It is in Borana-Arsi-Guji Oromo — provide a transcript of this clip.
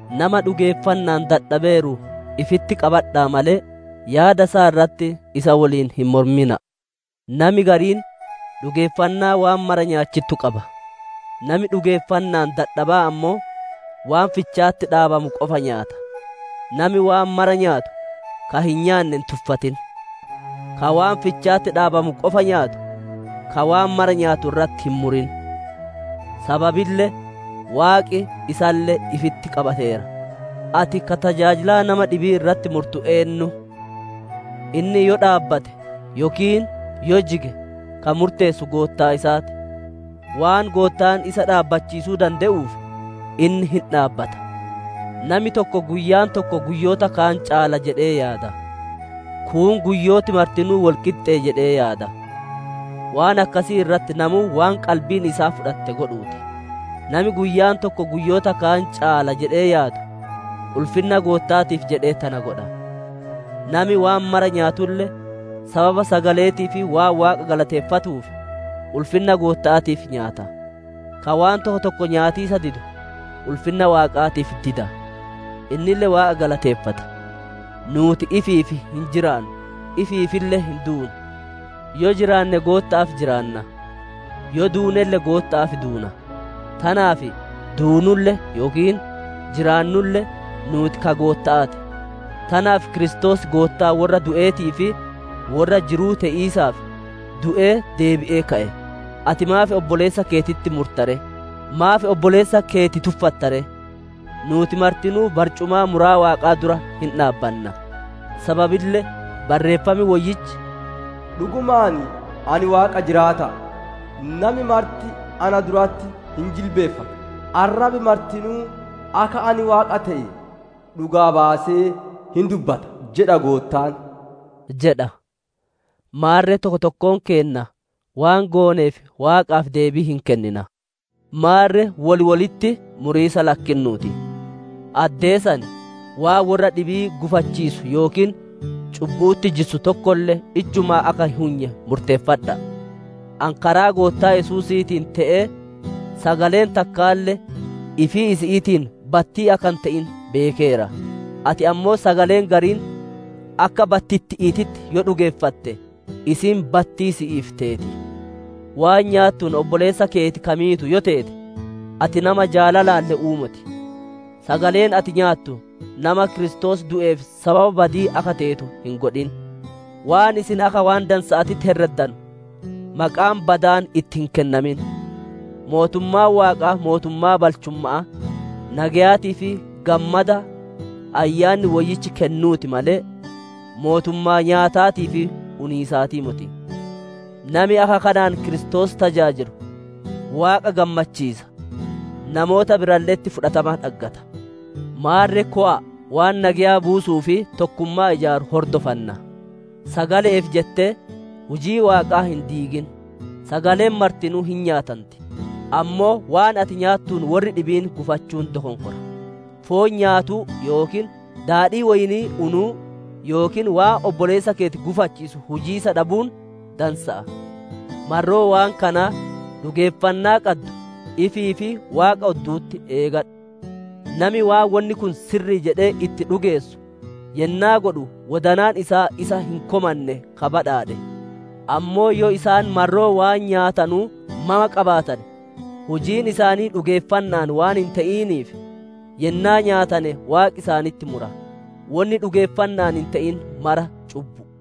Nama dhugeeffanna'aan dadhabeeru ifitti qabadha'a malee, yaada isaa irratti isa woliin hin mormina'a. Nami gariin dhugeeffannaa waan mara nyaachittu qaba; nami dhugeeffanna'aan dadhaba'aa ammoo waan ficha'atti dhaabamu qofa nyaata. Nami waan mara nyaatu ka hin nyaanne hin tuffatin; ka waan ficha'atti dhaabamu qofa nyaatu ka waan mara nyaatu irratti hin murin; sababille Waaqi isalle ifitti qabateera. Ati ka tajaajilaa nama dhibi'ii irratti murtu eennu? Inni yoo dhaabbate, yookiin yoo jige ka murteessu Goottaa isaa ti. Waan Goottaan isa dhaabbachiisuu dande'uuf, inni hin dhaabbata. Nami tokko guyyaan tokko guyyoota kaan caala jedhee yaada; kuun guyyooti martinuu wol qixxe'e jedhee yaada. Waan akkasii irratti namuu waan qalbiin isaa fudhatte godhuu ti. Nami guyyaan tokko guyyoota kaan caala jedhee yaadu ulfinna Gootta'aatiif jedhee tana godha. Nami waan mara nyaatulle, sababa sagale'eetiif waan Waaqa galateeffatuuf, ulfinna Gootta'aatiif nyaata. Ka waan tokko tokko nyaatiisa didu, ulfinna Waaqaatiif dida. Innille Waaqa galateeffata. Nuuti ifiif hin jiraannu; ifiifille hin duunu. Yoo jiraanne, Gootta'aaf jiraanna; yoo duunelle, Gootta'aaf duuna; tanaaf, duunulle yookiin jiraannulle, nuuti ka Gootta'aa ti. Tanaaf Kiristoos Goottaa worra du'eetii fi worra jiruu te'iisaaf, du'ee deebi'ee ka'e. Ati maaf obboleessa keetitti murta ree? Maaf obboleessa keeti tuffatta ree? Nuuti martinuu barcumaa muraa Waaqaa dura hin dhaabbanna. Sababille Barreeffam Woyyichi, «‹Dhugumaan Ani Waaqa jiraata'a! Nami marti na duratti hin jilbiiffata; arrabi martinuu akka ani Waaqa te'e dhugaa baasee hin dubbata› jedha Goottaan» jedha. Maarre tokko tokkoon keenna waan gooneef Waaqaaf deebii hin kennina. Maarre wol wolitti muriisa lakkinnuu ti. Addee san waan worra dhibii gufachiisu yookiin cubbu'utti jissu tokkolle ijjumaa akka hin hunye murteeffadha'a. Ani karaa Goottaa Yesuusiitiin te'ee sagaleen takkaalle ifii isi'iitiin battii akka hin te'in beekeera; ati ammoo sagaleen gariin akka battitti'iititti yoo dhugeeffatte, isiin battii si'iif teeti. Waan nyaattuun obboleessa keeti ka miitu yoo teete, ati nama jaalalaan le'uu moti. Sagaleen ati nyaattu nama Kiristoos du'eef sababa badi'ii akka teetu hin godhin. Waan isin akka waan dansa'aatitti herreddanu maqaan badaan itti hin kennamin. Mootummaan Waaqaa mootummaa balchumma'aa, nageyaatii fi gammada Ayyaanni Woyyichi kennuu ti malee, mootummaa nyaataatii fi uniisaatii moti. Nami akka kanaan Kiristoos tajaajilu, Waaqa gammachiisa, namoota biralle'etti fudhatama dhaggata. Maarre kowa'a waan nageya buusuu fi tokkummaa ijaaru hordofanna. Sagale'eef jettee, hujii Waaqaa hin diigin. Sagaleen martinuu hin nyaatanti, ammoo waan ati nyaatuun worri dhibiin gufachuun dokonkora. Foon nyaatuu yookiin daadhii woyni'ii unuu yookiin waan obboleessa keeti gufachiisu hujiisa dhabuun dansa'a. Marroo waan kanaa dhugeeffannaa qaddu, ifii fi Waaqa oddu'utti eegadhu. Nami waan wonni kun sirri'i jedhee itti dhugeessu yennaa godhu wodanaan isaa isa hin komanne ka badhaadhe. Ammoo yoo isaan marroo waan nyaatanuu mama qabaatane, hujiin isaanii dhugeeffanna'aan waan hin te'iniif, yennaa nyaatane Waaqi isaanitti mura. Wonni dhugeeffanna'aan hin te'in maraa cubbu'u.